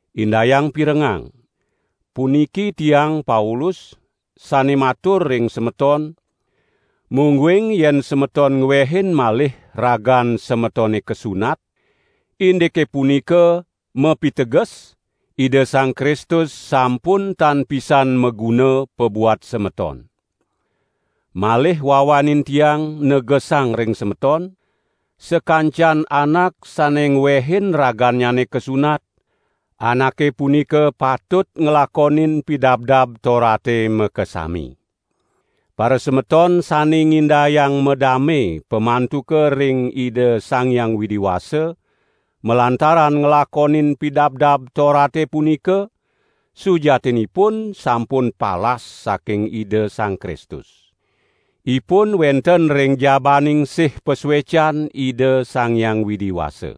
Indayang pirengang! Puniki tiang Paulus sane matur ring semeton, mungguing yen semeton ngwehin malih ragan semetone kasunat, indike punika mapiteges, Ida Sang Kristus sampun tan pisan maguna pabuat semeton. Malih wawanin tiang negesang ring semeton, sakancan anak sane ngwehin ragannyane kasunat, anake punika patut nglakonin Pidabdab Torate makasami. Parasemeton sane ngindayang madame pamantuka ring Ida Sang Hyang Widi Wasa, malantaran nglakonin Pidabdab Torate punika, sujatinipun sampun palas saking Ida Sang Kristus. Ipun wenten ring jabaning sih pasuecan Ida Sang Hyang Widi Wasa.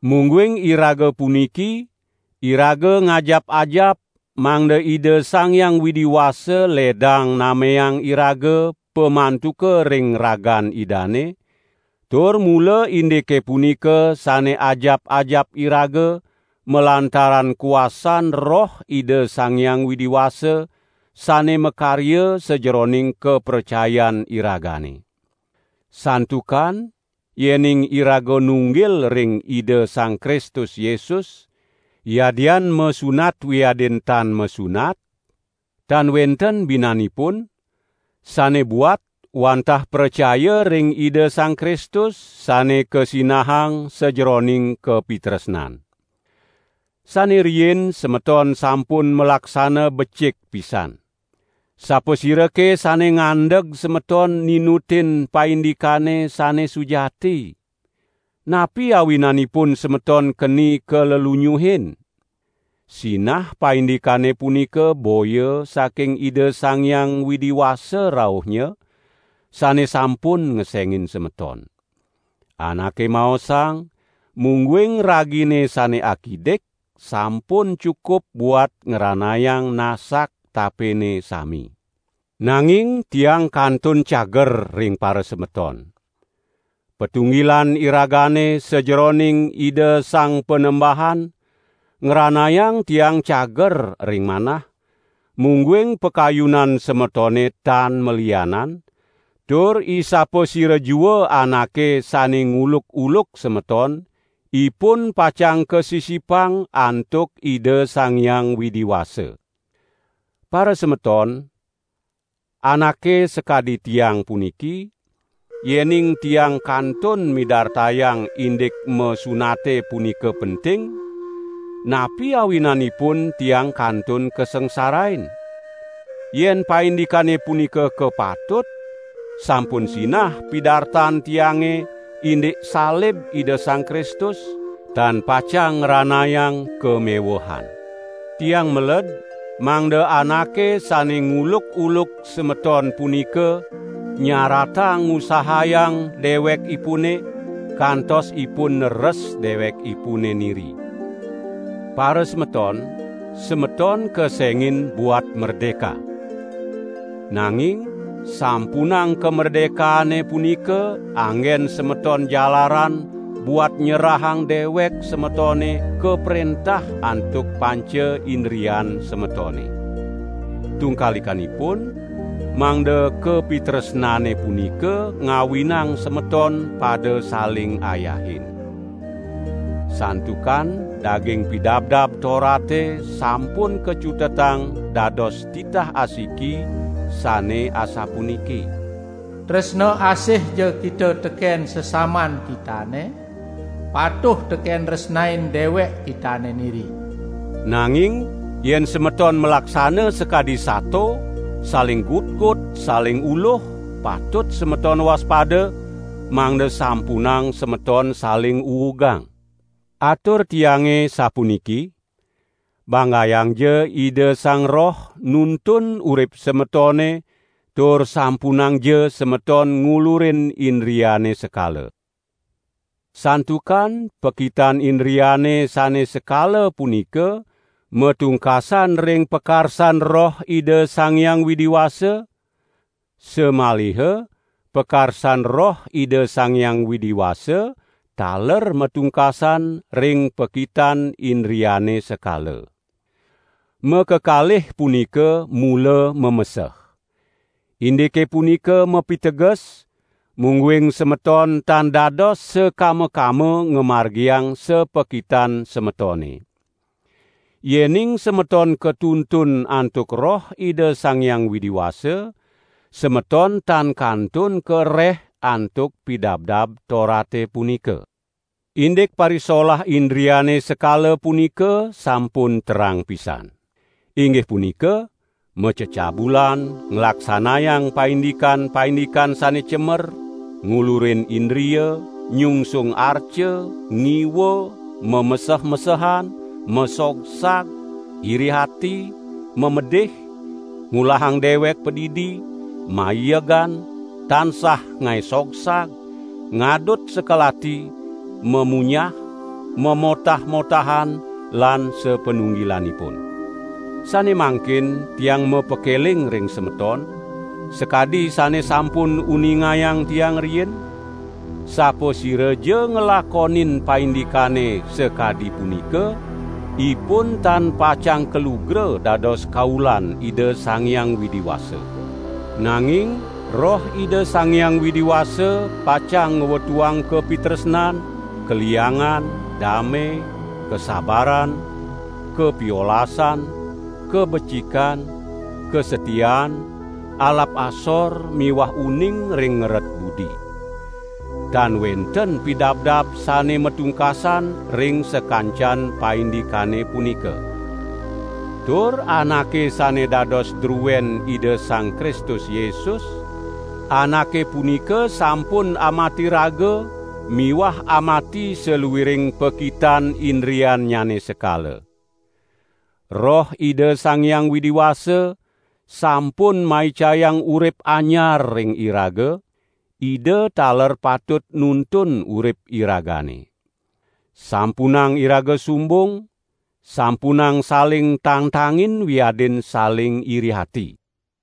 Mungguing iraga puniki, iraga ngajap-ajap mangda Ida Sang Hyang Widi Wasa ledang nameang iraga pamantuka ring ragan Idane; tur mula indike punika sane ajap-ajap iraga malantaran kuasan Roh Ida Sang Hyang Widi Wasa sane makarya sajeroning kapracayan iragane. Santukan yening iraga nunggil ring Ida Sang Kristus Yesus, yadian masunat wiadin tan masunat, tan wenten binanipun; sane buat wantah pracaya ring Ida Sang Kristus sane kasinahang sajeroning kapitresnan. Sane riin semeton sampun malaksana becik pisan. Sapasirake sane ngandeg semeton ninutin paindikane sane sujati? Napi awinanipun semeton keni kalelunyuhin? Sinah paindikane punika boya saking Ida Sang Hyang Widi Wasa rauhnya, sane sampun ngesengin semeton. Anake maosang, mungguing ragine sane akidik sampun cukup buat ngranayang nasak tapene sami. Nanging tiang kantun cager ring parasemeton. Patunggilan iragane sajeroning Ida Sang Panembahan ngranayang tiang cager ring manah, mungguing pakayunan semetone tan malianan, tur isapasira jua anake sane nguluk-uluk semeton, ipun pacang kasi-sipang antuk Ida Sang Hyang Widi Wasa. Parasemeton, anake sakadi tiang puniki, yening tiang kantun midartayang indik masunate punika penting, napi awinanipun tiang kantun kasangsarain? Yen paindikane punika kapatut, sampun sinah pidartan tiange indik salib Ida Sang Kristus, tan pacang ngranayang kamewehan. Tiang meled mangda anake sane nguluk-uluk semeton punika nyaratang ngusahayang dewekipune, kantos ipun neres dewekipune niri. Parasemeton, semeton kesengin buat merdeka. Nanging sampunang kamerdekaane punika anggen semeton jalaran buat nyerahang dewek semetone kaprentah antuk panca indrian semetone. Tungkalikanipun mangda kapitresnane punika ngawinang semeton pada saling ayahin. Santukan daging Pidabdab Torate sampun kacutetang dados titah asiki, sane asapuniki: "Tresna asihja kita teken sesaman kitane, patuh teken nresnain dewek kitane niri." Nanging yen semeton malaksana sakadi sato, saling gutgut, saling uluh, patut semeton waspada, mangda sampunang semeton saling uugang. Atur tiange sapuniki! Banggayangja Ida Sang Roh nuntun urip semetone tur sampunangja semeton ngulurin indriane sekala. Santukan pakitan indriane sane sekala punika matungkasan ring pakarsan Roh Ida Sang Hyang Widi Wasa, samaliha pakarsan Roh Ida Sang Hyang Widi Wasa taler matungkasan ring pakitan indriane sekala. Makakalih punika mula mameseh. Indike punika mapiteges, mungguing semeton tan dados sakama-kama ngamargiang sapakitan semetone. Yening semeton katuntun antuk Roh Ida Sang Hyang Widi Wasa, semeton tan kantun kareh antuk Pidabdab Torate punika. Indik parisolah indriane sekala punika sampun terang pisan. Inggih punika: macecabulan, nglaksanayang paindikan-paindikan sane cemer, ngulurin indria, nyungsung arca, ngiwa, mameseh-mesehan, masogsag, iri ati, mamedih, ngulahang dewek padidi, maiegan, tansah ngae sogsag, ngadut sekel ati, mamunyah, mamotah-motahan lan sapanunggilanipun. Sane mangkin tiang mapakeling ring semeton, sakadi sane sampun uningayang tiang riin, sapasiraja nglakonin paindikane sakadi punika, ipun tan pacang kalugra dados kaulan Ida Sang Hyang Widi Wasa. Nanging Roh Ida Sang Hyang Widi Wasa pacang ngwetuang kapitresnan, kaliangan, dame, kasabaran, kapiolasan, kabecikan, kasatiaan, alap asor miwah uning ring ngeret budi. Tan wenten pidabdab sane matungkasan ring sakancan paindikane punika. Tur anake sane dados druen Ida Sang Kristus Yesus, anake punika sampun amati raga miwah amati saluiring pakitan indriannyane sekala. Roh Ida Sang Hyang Widi Wasa sampun maicayang urip anyar ring iraga; Ida taler patut nuntun urip iragane. Sampunang iraga sumbung, sampunang saling tangtangin wiadin saling iri ati.